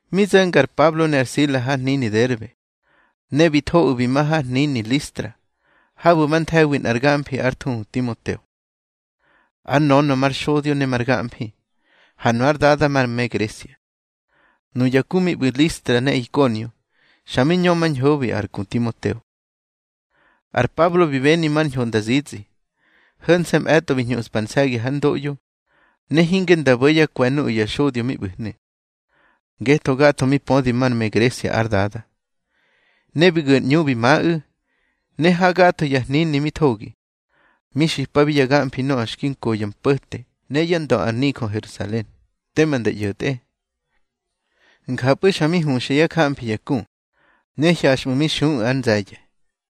Mi zo̱nga ar Pablo ne ar Sila har hnini Derbe, ne bi thoꞌu̱ bi ma har hnini Listra, habu̱ ba nthe̱wi nꞌar gamfi ár thuhu Timoteo. Ár nönö mar xodyo ne mar gamfi, ha nu ár dada mar me Gresia. Nuya ku mi ꞌbu̱ Listra ne Ikonio, xa mi ñömañhobi ar ku Timoteo. Ar Pablo bi beni mar ñho nda zitsꞌi. Ho̱nse̱ mꞌe̱tꞌo bi hñuꞌspa ar nse̱gi hár ndoꞌyo, ne hinge nda bo̱ yá kwe̱ nuꞌu̱ ya xodyo mi ꞌbu̱hnu̱, ngetho gatho mi pödi már me Gresia ár dada. Ne bi gu̱ ar ꞌñu bi maꞌu̱, ne ha gatho ya hnini mi thogi, mi xipabi ya gamfi nöꞌö xki nko ya mpo̱te ne yá ndö ar nijö Herusalen, tema nda ꞌyo̱tꞌe. Njapꞌu̱ xa mi huxa yá jamfi ya ku, ne hyaxꞌmu̱ mi xuꞌu̱ ár nze̱ye̱.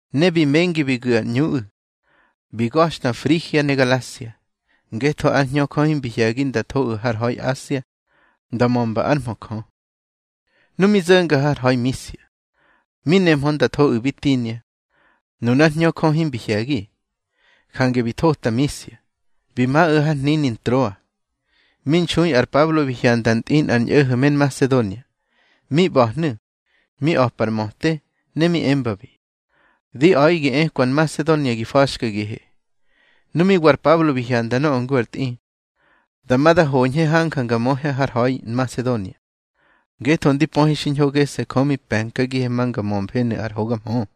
Ne bi mengi bi gu̱ yá ꞌñuꞌu̱, bi ga̱xta Frigia ne Galasia, ngetho ár Hñö Jö himbi hye̱gi nda thoꞌu̱ har ha̱i Asia nda mömba ár mhö Jö. Nu mi zo̱nga har ha̱i Misia, mi nehmö nda thoꞌu̱ Bitinia, nunár Hñö Jö himbi hye̱gi. Jange bi thota Misia, bi maꞌu̱ har hnini Ntroa. Mi nxui ar Pablo bi hyanda ntꞌi nꞌar ñꞌo̱ho̱ me Nmasedonia, mi ꞌba̱hnu̱, mi a̱pa ar möte, ne mi embabi: Di a̱ꞌi gi ekwa Nmasedonia gi fa̱xkagihe. Nu mi wa ar Pablo bi hyanda nöꞌö ngu ar tꞌi, dama da hoñhe hanja nga möhe har ha̱i Nmasedonia, ngetho ndi pöhe xiñho gese̱ Jö mi pe̱nkagihe ma nga mömfenu̱ ar hoga mhö.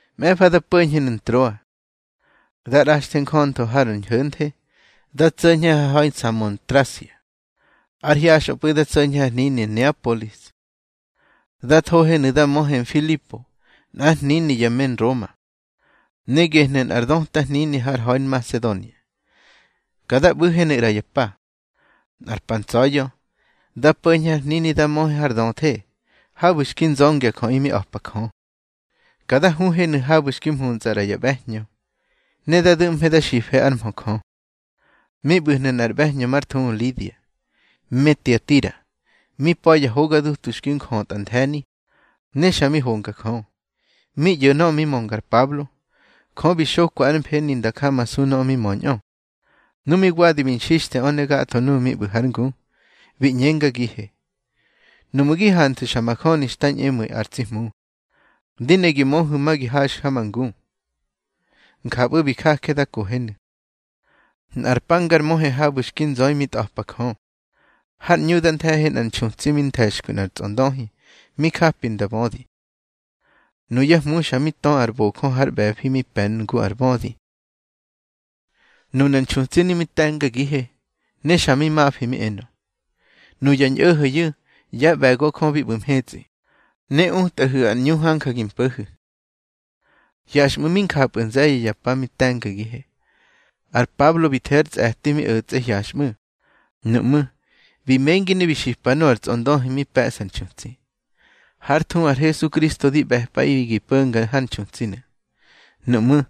Mꞌe̱fa da po̱ñhenu̱ Ntroa, da ꞌraxe njöntho har ñho̱nthe, da tso̱ñhe har ha̱i Samotrasia. Ár hyaxꞌöpꞌu̱ da tso̱ñhe har hnini Neapolis. Da thohenu̱ da möhe Nfilipo nꞌár hnini ya me Nroma, ne gehnu̱ nꞌar döta hnini har ha̱i Nmasedonia. Ka da ꞌbu̱henu̱ ꞌra ya pa. Nꞌar pa ntsa̱ya̱, da po̱ñhe har hnini da möhe har döthe, habu̱ xki nzöngya jöꞌi mi a̱pa Jö. Ka da huhenu̱ habu̱ xki mhuntsꞌa ꞌra ya ꞌbe̱hñö, ne da du̱ꞌmhe da xife ár mhö Jö. Mi ꞌbu̱hnu̱ nꞌar ꞌbe̱hñö mar thuhu Lidia, me Tiatira. Mi pa̱ ya hoga dutu xki njötꞌa the̱ni, ne xa mi honga Jö. Mi ꞌyo̱ nöꞌö mi mönga ar Pablo, Jö bi xokwa ár mfeni nda jamasu ñöꞌö mi möñꞌö. Nu mi wadi bi nxixtheꞌö ne gatho nuꞌu̱ mi ꞌbu̱ hár ngu, bi ꞌñengagihe: —Nuꞌmu̱ gi hanthu̱ xa majöni xta ñꞌemu̱i ar tsi Hmu, di ne gi möhu̱ ma gi haxu̱ ha ma ngu. Njapꞌu̱ bi jaje da kohenu̱. Nꞌar pa ngar möhe habu̱ xki nzöi mi tꞌa̱pa Jö, har ꞌñu da nthe̱he nꞌar nxutsi mi nthe̱xkwi nꞌar tsꞌondöhi mi japi nda bödi. Nuyá hmu xa mi tö nze̱ ar bojö har ꞌbe̱fi mi pe̱ ngu ar bödi. Nunar nxutsinu̱ mi te̱ngagihe, ne xa mi mafi mi enö: —Nuya ñꞌo̱ho̱yu̱ yá ꞌbe̱go Jö bi ꞌbu̱ mhetsꞌi, ne utꞌahu̱ ar ꞌñu hanja gi mpo̱hu̱. Hyaxꞌmu̱ mi njapꞌu̱ nze̱ye̱ ya pa mi te̱ngagihe. Ar Pablo bi the ár tsꞌe̱ti mi o̱tsꞌe hyaxꞌmu̱. Nuꞌmú̱, bi mengi ne bi xipa nöꞌö ar tsꞌondöhi mi pe̱ꞌsa ar nxutsi: —Hár thuhu ar Hesukristo di ꞌbe̱pꞌaꞌi gi po̱nga har nxutsinu̱. Nuꞌmú̱,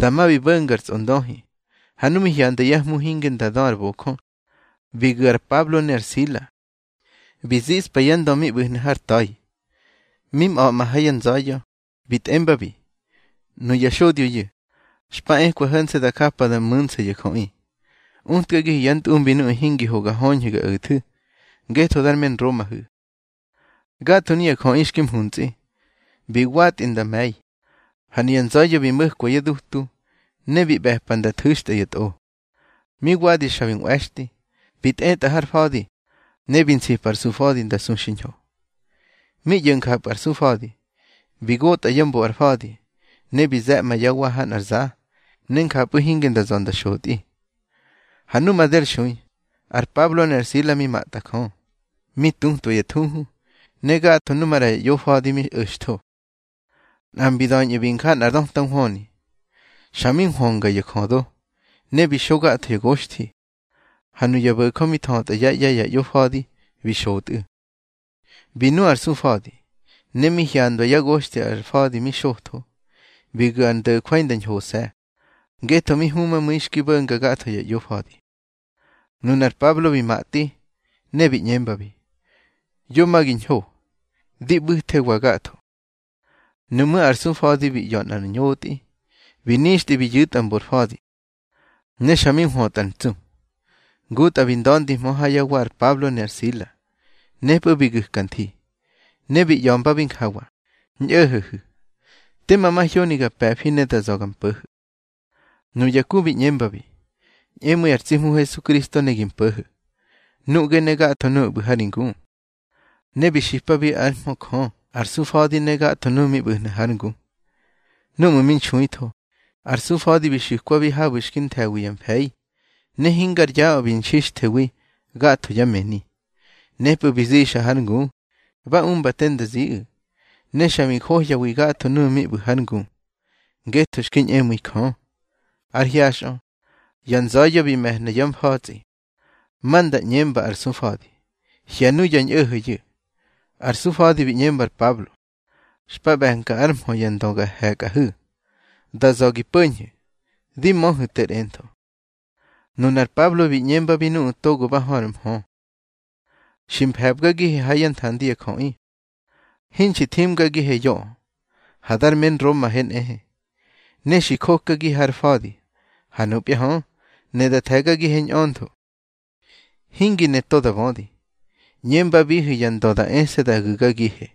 dama bi bo̱nga ar tsꞌondöhi. Ha nu mi hyanda yá hmu hinge nda dö ar bojö, bi gu̱ ar Pablo ne ar Sila, bi ziꞌspa yá ndö mi ꞌbu̱hnu̱ har ta̱i. Mi mꞌa̱ꞌma ha ya nza̱ya̱, bi tꞌembabi: —Nuya xodyoyu̱, xpa ekwa ho̱nse̱ da japa da mu̱nsa ya jöꞌi. Utkagihu̱ yá ntꞌumbi nuꞌu̱ hingi ho ga höñhu̱ ga o̱thu̱, ngetho dar me Nromahu̱. Gatho nuya jöꞌi xki mhuntsꞌi, bi watꞌi nda me̱i. Ha nuya nza̱ya̱ bi mo̱kwa yá dutu, ne bi ꞌbe̱pa nda thu̱xtꞌa ya tꞌo. Mi wadi xa bi nꞌwe̱xtꞌi, bi tꞌetꞌa har fa̱di, ne bi nsipa ar sufa̱di nda su xiñho. Mi ꞌyo̱ njapꞌu̱ ar sufa̱di, bi gotꞌa ya mbo ar fa̱di, ne bi ze̱ꞌmba yá wa ha nꞌar za, ne njapꞌu̱ hinge nda za̱ nda xotꞌi. Ha nu made ar xui, ar Pablo ne ar Sila mi matꞌa Jö, mi tutwa ya thuhu, ne gatho nu maꞌra ya ꞌyofa̱di mi o̱xtho. Nꞌa mbi da̱ñꞌu̱ bi nja nꞌar döta nhwöni. Xa mi nhwönga ya jödo, ne bi xo gatho ya goxthi, ha nuya bo̱jö mi thötꞌa yá ꞌye̱ ya ꞌyofa̱di bi xotꞌu̱. Bi nu ar sufa̱di, ne mi hyandwa yá goxthi ar fa̱di mi xotho, bi gu̱ ár ndo̱jwai nda ñhose̱, ngetho mi humamu̱i xki bo̱nga gatho ya ꞌyofa̱di. Nunar Pablo bi matꞌi, ne bi ꞌñembabi: —Yo ma gi ñho. Di ꞌbu̱thewa gatho. Nuꞌmú̱ ar sufa̱di bi ꞌya̱ nꞌar ñotꞌi, bi nixtꞌi bi yu̱tꞌa mbor fa̱di, ne xa mi nhwötꞌar ntsu. Ngutꞌa bi nda̱ndihmö ha yá wa ar Pablo ne ar Sila. Nepꞌu̱ bi gu̱ka nthi, ne bi ꞌya̱mbabi njawa: —Ñꞌo̱ho̱hu̱, tema mahyoni ga pe̱fi ne da za̱ ga mpo̱ho̱. Nuya ku bi ꞌñembabi: —Ñꞌemu̱i ar tsi Hmu Hesukristo ne gi mpo̱ho̱, nuꞌge ne gatho nuꞌu̱ ꞌbu̱ ha ri ngu. Ne bi xipabi ár mhö Jö ar sufa̱di ne gatho nuꞌu̱ mi ꞌbu̱hnu̱ hár ngu. Núꞌmu̱ mi nxuitho, ar sufa̱di bi xu̱kwabi habu̱ xki nthe̱wi ya mfe̱i. Ne hingar yaꞌö bi nxixthewi gatho yá mëni. Nepꞌu̱ bi zixa hár ngu, ba umba te nda ziꞌu̱. Ne xa bi njohyawi gatho nuꞌu̱ mi ꞌbu̱ hár ngu, ngetho xki ñꞌemu̱ibi Jö. Ár hyaxꞌö, ya nza̱ya̱ bi me̱hna yá mfa̱tsꞌi, ma nda ꞌñemba ar sufa̱di: —Hye̱ nuya ñꞌo̱ho̱yu̱. Ar sufa̱di bi ꞌñemba ar Pablo: —Xpa ꞌbe̱nka ár mhö ya ndö ga he̱kꞌahu̱. Da za̱ gi po̱ñhu̱, di möhu̱ ter entho. Nunar Pablo bi ꞌñembabi nuꞌu̱ togo ba hö ar mhö: —Xi mfe̱bgagihe ha yá nthandi ya jöꞌi, hinxi thimgagihe yoꞌö, ha dar me Nromahe nꞌehe, ne xi jokagihe har fa̱di. Ha nupya hö, ne da the̱gagihe ñꞌöntho, hingi ne to da bödi. ꞌÑembabihu̱ ya ndö da ese̱ da gu̱gagihe.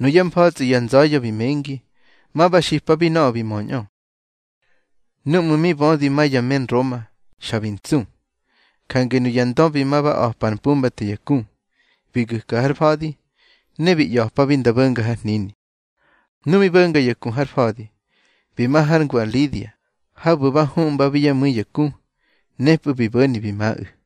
Nuyá mfa̱tsꞌi ya nza̱ya̱ bi mengi, ma ba xipabi nöꞌö bi möñꞌö. Núꞌmu̱ mi bödi ma ya me Nroma, xa bi ntsu. Jange nuya ndö bi ma ba a̱pa ar mpumbate ya ku, bi gu̱ka har fa̱di, ne bi ꞌya̱pabi nda bo̱nga har hnini. Nu mi bo̱nga ya ku har fa̱di, bi ma hár ngu ar Lidia, habu̱ ba huꞌmbabi yá mu̱i ya ku. Nepꞌu̱ bi bo̱ni bi maꞌu̱.